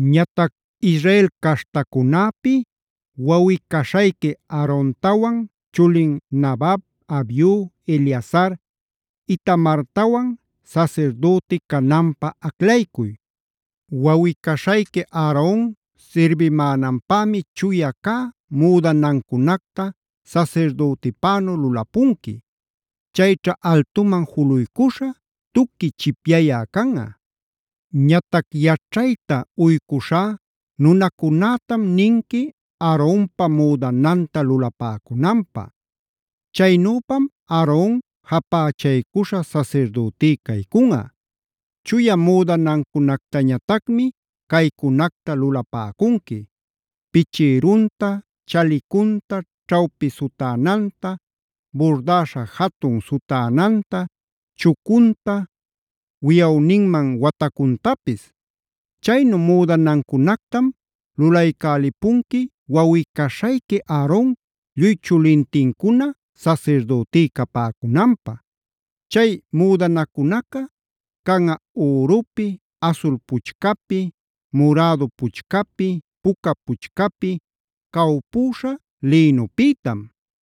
“Ñatac Israel caśhtacunäpi wawꞌi-caśhayqui Aarontawan chulin Nadab, Abiu, Eleazar, Itamartawan sasirdüti cananpä aclaycuy. Wawꞌi-caśhayqui Aaron sirbimänanpämi chuya cä müdanacunacta sasirdütipänu lulapunqui. Chayćha altuman juluycuśha, tuqui chipyayä canꞌa. Ñatac yaćhayta uycushá nunacunätam ninqui Aaronpa müdananta lulapäcunanpä. Chaynüpam Aaron japächaycuśha sasirdütí caycunꞌa. Chuya müdanancunactañatacmi caycunacta lulapäcunqui: pichïrunta, chalicunta,a ćhawpi sutänanta, burdäśha jatun sutänanta, chucunta, wiyawninman watacuntapis. Chaynu müdanacunactam lulaycälipunqui wawꞌi-caśhayqui Aaron lluy chulintincuna sasirdütí capäcunanpä. Chay müdanacunaca canꞌa ürupi, asul puchcapi, murädu puchcapi, puca puchcapi, cawpüśha lïnupïtam.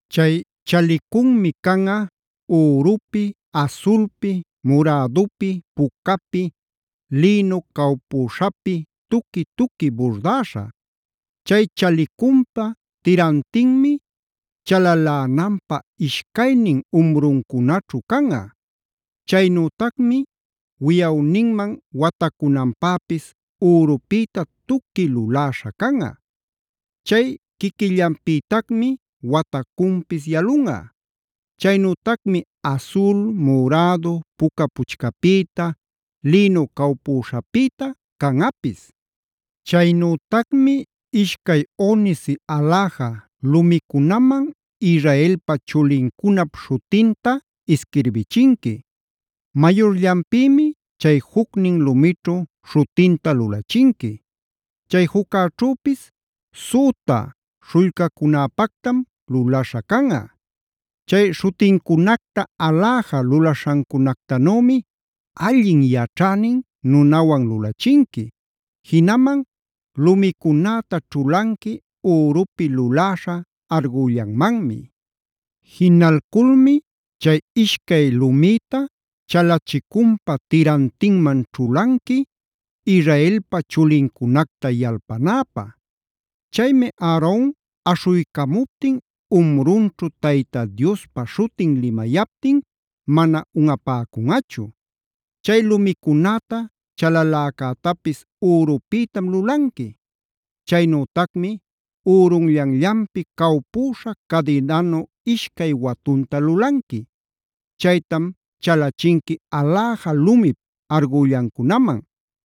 “Chay chalicunmi canꞌa: ürupi, asulpi, murädupi, pucapi, lïnu cawpüśhapi tuqui-tuqui burdäśha. Chay chalicunpa tirantinmi chalalänanpä ishcaynin umruncunaćhu canꞌa. Chaynütacmi wiyawninman watacunanpäpis ürupïta tuqui luläśha canꞌa. Chay quiquillanpïtacmi watacunpis yalunꞌa. Chaynütacmi asul, murädu, puca puchcapïta, lïnu cawpuśhapïta canꞌapis. “Chaynütacmi ishcay onice aläja lumicunaman Israelpa chulincunap śhutinta isquirbichinqui. Mayurllanpïmi chay jucnin lumićhu śhutinta lulachinqui. Chay juccäćhüpis süta śhullcacunäpatacmi lulaśhä canꞌa. Chay śhutincunacta aläja lulaśhancunactanümi allin yaćhänin nunawan lulachinqui. Jinaman lumicunäta ćhulanqui ürupi luläśha argüllanmanmi. Jinalculmi chay ishcay lumïta chalicunpa tirantinman ćhulanqui, Israelpa chulincunacta yalpanäpä. Chaymi Aaron aśhuycamuptin umrunćhu Tayta Diospa śhutin limayaptin mana unꞌapäcunꞌachu. Chay lumicunäta chalaläcätapis ürupïtam lulanqui. Chaynütacmi ürunllanllanpi cawpüśha cadinanu ishcay watunta lulanqui. Chaytam chalachinqui aläja lumip argüllancunaman.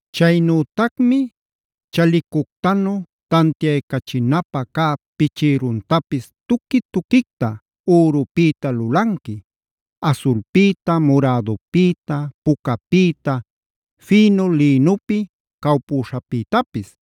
“Chaynütacmi chalicuctanu tantiaycachinapä cä pichïruntapis tuqui-tuquicta ürupïta lulanqui: asulpïta, murädupïta, pucapïta, fïnu lïnupi cawpüśhapïtapis.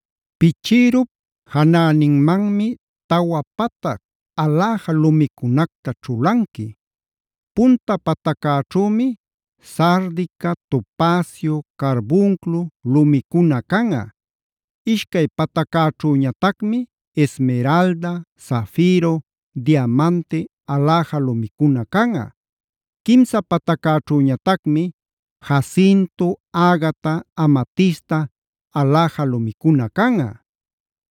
Pichïrup janäninmanmi tawa patac aläja lumicunacta ćhulanqui. Punta pataccäćhümi sardica, topacio, carbunclo lumicuna canꞌa. Ishcay pataccäćhüñatacmi esmeralda, zafiro, diamante aläja lumicuna canꞌa. Quimsa pataccäćhüñatacmi jacinto, agata, amatista aläja lumicuna canꞌa.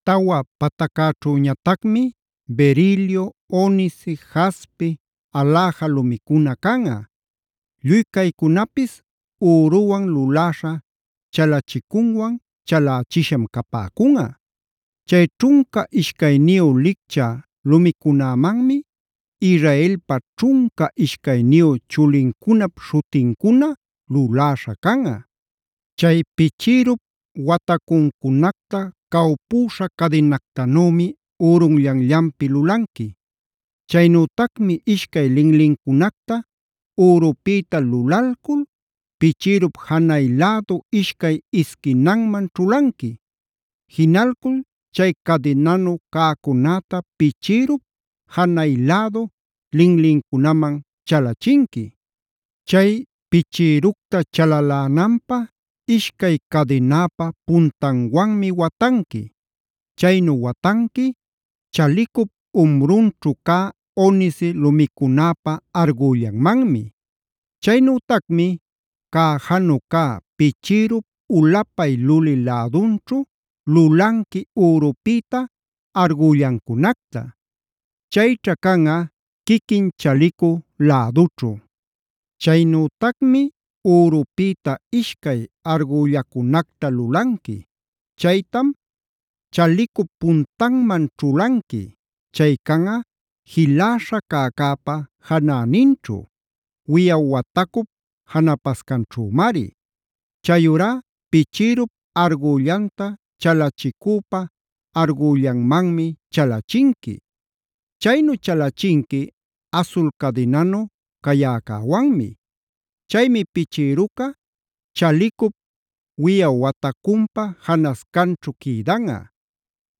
Tawa pataccäćhüñatacmi berilio, onice, jaspe aläja lumicuna canꞌa. Lluy caycunapis üruwan luläśha chalachicunwan chalächisham capäcunꞌa. Chay ćhunca ishcayniyu licchä lumicunämanmi Israelpa ćhunca ishcayniyu chulincunap śhutincuna luläśha canꞌa. “Chay pichïrup watacuncunacta cawpüśha cadinactanümi ürunllanllanpi lulanqui. Chaynütacmi ishcay linlincunacta ürupïta lulalcul pichïrup janay lädu ishcay isquinanman ćhulanqui. Jinalcul chay cadinanu cäcunäta pichïrup janay lädu linlincunaman chalachinqui. Chay pichïructa chalalänanpä ishcay cadinäpa puntanwanmi watanqui. Chaynu watanqui chalicup umrunćhu cä onice lumicunäpa argüllanmanmi. Chaynütacmi cäjanu cä pichïrup ulapay lulï lädunćhu lulanqui ürupïta argüllancunacta. Chayćha canꞌa quiquin chalicu lädućhu. Chaynütacmi ürupïta ishcay argüllacunacta lulanqui. Chaytam chalicup puntanman ćhulanqui. Chay canꞌa jiläśha cäcäpa janäninćhu; wiyaw watacup janapascanćhümari. Chayurá pichïrup argüllanta chalicüpa argüllanmanmi chalachinqui. Chaynu chalachinqui asul cadinanu cayäcäwanmi. Chaymi pichïruca chalicup wiꞌaw watacunpa janascanćhu quïdanꞌa.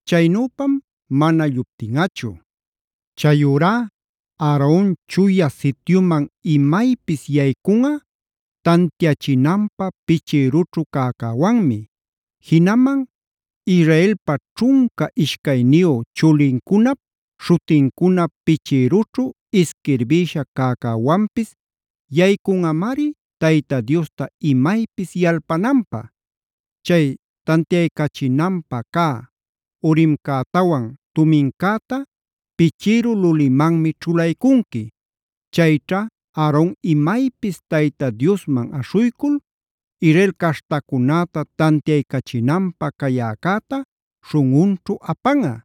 Chaynüpam mana lluptinꞌachu. “Chayurá Aaron Chuya Sityuman imaypis yaycunꞌa tantiachinanpä pichïrućhu cäcäwanmi. Jinaman Israelpa ćhunca ishcayniyu chulincunap śhutincuna pichïrućhu isquirbïsha cäcäwanpis yaycunꞌamari Tayta Diosta imaypis yalpananpä. Chay tantiaycachinapä cä Urimcätawan Tumimcätab pichïru lulimanmi ćhulaycunqui. Chayćha Aaron imaypis Tayta Diosman aśhuycul Israel caśhtacunäta tantiaycachinanpä cayäcäta śhunꞌunćhu apanꞌa.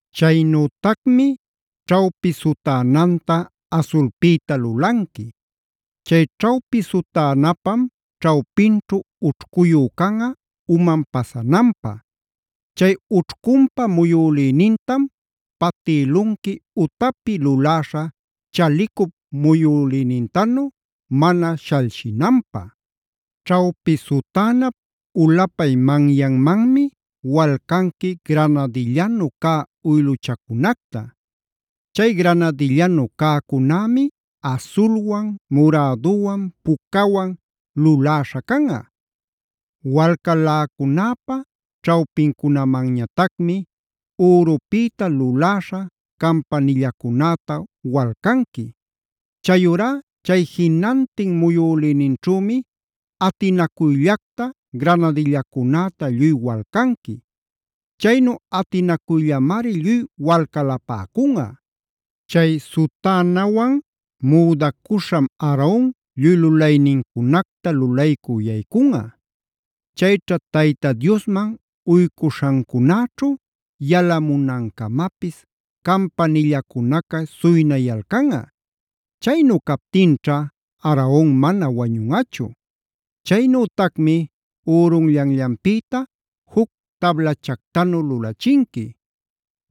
“Chaynütacmi ćhawpi sutänanta asulpïta lulanqui. Chay ćhawpi sutänapam ćhawpinćhu ućhcuyu canꞌa uman pasananpä. Chay ućhcunpa muyülïnintam patïlunqui utapi luläśha chalicup muyülïnintanu mana shalshinanpä. Ćhawpi sutänap ulapay manyanmanmi walcanqui granadillanu cä uyluchacunacta. Chay granadillanu cäcunämi asulwan, muräduwan, pucawan luläśha canꞌa. Walcaläcunäpa ćhawpincunamanñatacmi ürupïta luläśha campanillacunäta walcanqui. Chayurá chay jinantin muyülïninćhümi atinacuyllacta granadillacunäta lluy walcanqui. Chaynu atinacuyllamari lluy walcalapäcunꞌa. Chay sutänawan müdacuśham Aaron lluy lulaynincunacta lulaycü yaycunꞌa. Chayćha Tayta Diosman uycuśhancunäćhu yalamunancamapis campanillacunaca suynayalcanꞌa. Chaynu captinćha Aaron mana wañunꞌachu. “Chaynütacmi ürunllanllanpïta juc tablachactanu lulachinqui.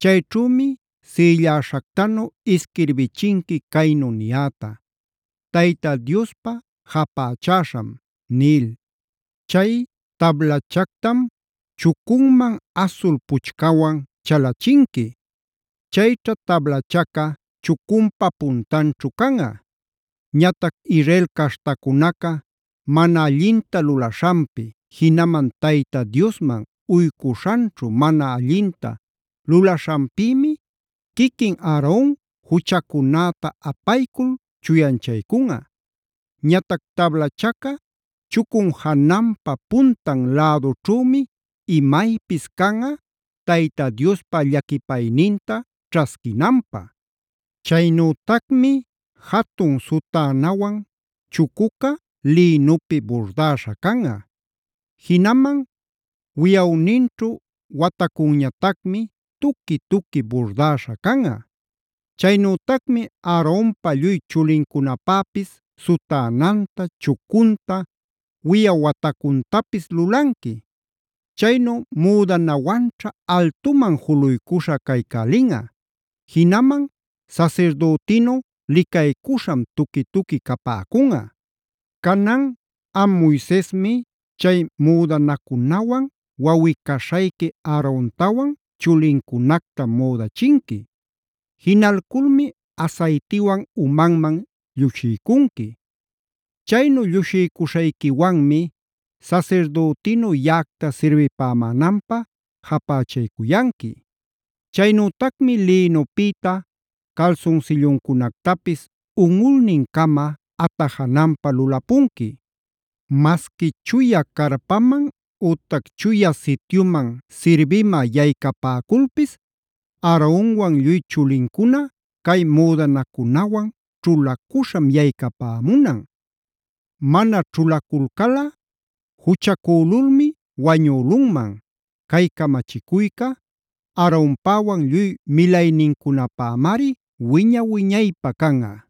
Chayćhümi sïlläśhactanu isquirbichinqui caynu niyäta: ‘Tayta Diospä japächäśham’ nil. Chay tablachactam chucunman asul puchcawan chalachinqui. Chayćha tablachaca chucunpa puntanćhu canꞌa. Ñatac Israel caśhtacunaca mana allinta lulaśhanpi, jinaman Tayta Diosman uycuśhanćhu mana allinta lulaśhanpïmi quiquin Aaron juchacunäta apaycul chuyanchaycunꞌa. Ñatac tablachaca chucun jananpa puntan lädućhümi imaypis canꞌa Tayta Diospa llaquipayninta ćhasquinanpä. “Chaynütacmi jatun sutänawan chucuca lïnupi burdäśha canꞌa. Jinaman wiyawninćhu watacunñatacmi tuqui-tuqui burdäśha canꞌa. Chaynütacmi Aaronpa lluy chulincunapäpis sutänanta, chucunta, wiyaw watacuntapis lulanqui. Chaynu müdanawanćha altuman juluycuśha caycälinꞌa; jinaman sasirdütinu licaycuśham tuqui-tuqui capäcunꞌa. “Canan am Moisesmi chay müdanacunawan wawꞌi-caśhayqui Aarontawan chulincunacta müdachinqui. Jinalculmi asaytiwan umanman llushiycunqui. Chaynu llushiycuśhayquiwanmi sasirdütinu yaꞌacta sirbipämänanpä japächaycuyanqui. “Chaynütacmi lïnupïta calsunsilluncunactapis unꞌulnincama atajananpä lulapunqui. Masqui chuya carpaman ütac Chuya Sityuman sirbimä yaycapäculpis Aaronwan lluy chulincuna cay müdanacunawan ćhulacuśham yaycapämunan. Mana ćhulaculcalꞌa juchacülulmi wañülunman. Cay camachicuyca Aaronpäwan lluy milaynincunapämari wiña-wiñaypä canꞌa.